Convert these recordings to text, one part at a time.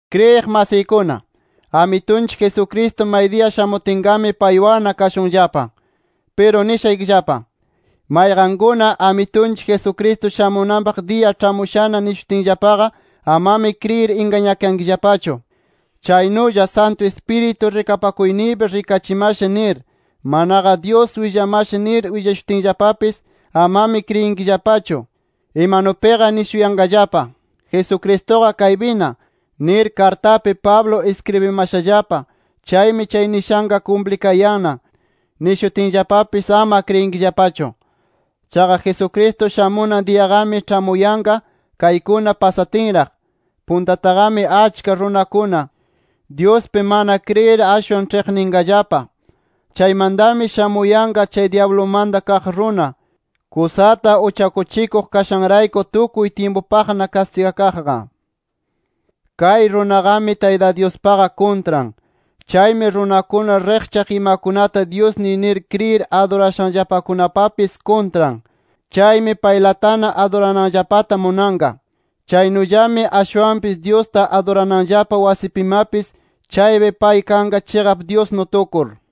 Kriyiq masiykuna, Amitunchik Jesucristo maydiya shamutinqami paywanna kashunllapa. Piru nishaykillapa: Mayqankuna Amitunchik Jesucristo shamunanpaq diya ĉhamushana nishunatinllapaqa, amami kriyir ingañakankillapachu. Chaynulla Santu Ispiritu rikapakuyniypi rikachimasha nir, manaqa Dyus willamasha nir willashutinllapapis, amami kriyinkillapachu. Imanupiqa nishuyanqallapa: “ ‘Jesucristuqa kaypina’ nir kartapi Pablo iskribimashallapa, chaymi chay nishanqa kumplikayanna” nishutinllapapis ama kriyinkillapachu. Chaqa Jesucristo shamunan diyaqami ĉhamuyanqa kaykuna pasatinraq: Puntataqami achka runakuna, Dyuspi mana kriyir ashwan ĉhiqninqallapa. Chaymantami shamuyanqa chay dyablumanta kaq runa, kusata uchakuchikuq kashanrayku tukuy tyimpupaqna kastigakaqqa. Kay runaqami, Tayta Dyuspaqa kuntran. Chaymi runakuna riqchaq imakunata dyusniy nir kriyir adurashanllapakunapapis kuntran. Chaymi paylatana adurananllapata munanqa. Chaynullami ashwanpis Dyusta adurananllapa wasipimapis chaypi pay kanqa chiqap Dyusnu tukur.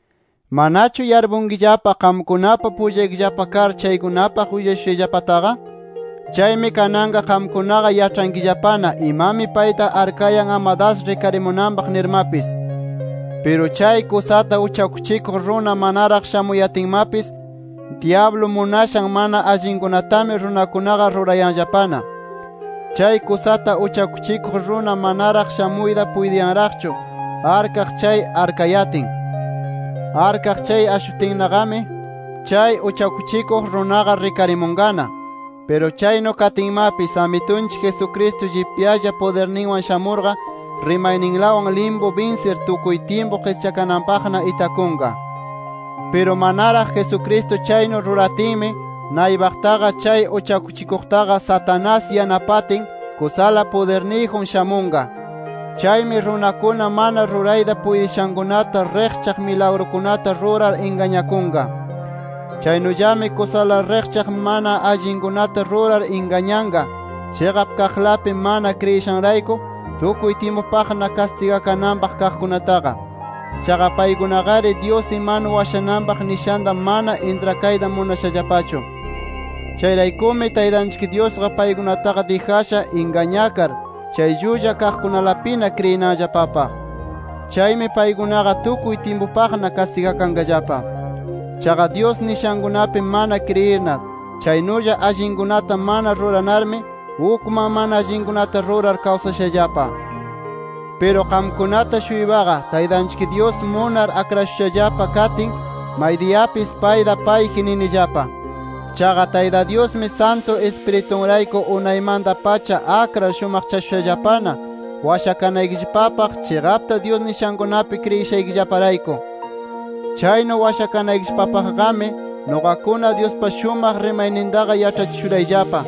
¿Manachu yarpunkillapa qamkunapa pullaykillapa kar chaykunapaq willashushayllapataqa? Chaymi kananqa qamkunaqa yaĉhankillapana imami payta arkayan ama das rikarimunanpaq nirmapis. Piru chay kusata uchakuchikuq runa manaraq shamuyatinmapis, dyablu munashan mana allinkunatami runakunaqa rurayanllapana. Chay kusata uchakuchikuq runa manaraq shamuyta puytinraqchu, arkaq chay arkayatin. Arkaq chay ashutinnaqami, chay uchakuchikuq runaqa rikarimunqana. Piru chaynu katinmapis Amitunchik Jesucristo llipyalla pudirninwan shamurqa, rimayninlawan limpu binsir, tukuy tyimpu qischakananpaqna itakunqa. Piru manaraq Jesucristo chaynu ruratinmi, naypaqtaqa chay uchakuchikuqtaqa Satanás yanapatin, kusala pudirniyjun shamunqa. Chaymi runakuna mana rurayta puytishankunata, riqchaq milagrukunata rurar ingañakunqa. Chaynullami kusala riqchaq mana allinkunata rurar ingañanqa, chiqap kaqlapi mana kriyishanrayku tukuy tyimpupaqna kastigakananpaq kaqkunataqa. Chaqa paykunaqari Dyus imanu washananpaq nishanta mana intrakayta munashallapachu. Chayraykumi Taytanchik Dyusqa paykunataqa dijasha ingañakar chay llulla kaqkunalapina kriyinanllapapaq. Chaymi paykunaqa tukuy tyimpupaqna kastigakanqallapa. Chaqa Dyus nishankunapi mana kriyinar, chaynulla allinkunata mana ruranarmi, ukman mana allinkunata rurar kawsashallapa. Piru qamkunata-shuypaqa Taytanchik Dyus munar akrashushallapa katin, maydiyapis payta payji ninillapa. Chaqa Tayta Dyusmi Santu Ispiritunrayku unaymanta-pacha akrar shumaqchashushallapana washakanaykillapapaq, chiqapta Dyus nishankunapi kriyishaykillaparayku. Chaynu washakanaykillapapaqmi nuqakuna Dyuspa shumaq rimaynintaqa yaĉhachishurayllapa.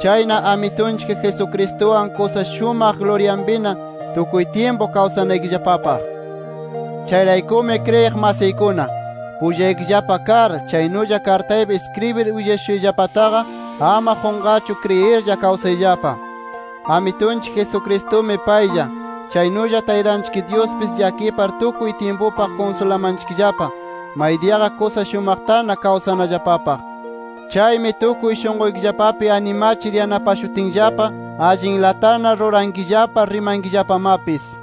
Chayna Amitunchik Jesucristuwan kusa shumaq luryanpina tukuy tyimpu kawsanaykillapapaq. Chayraykumi kriyiq masiykuna, pullaykillapa kar, chaynulla kartaypi iskribir willashushayllapataqa, ama qunqarchu kriyirlla kawsayllapa. Amitunchik Jesucristumi paylla, chaynulla Taytanchik Dyuspis llakipar tukuy tyimpupaq kunsulamanchikllapa, maydiyaqa kusa shumaqtana kawsanallapapaq. Chaymi tukuy shunquykillapapi animachir yanapashutinllapa, allinlatana rurankillapa, rimankillapamapis.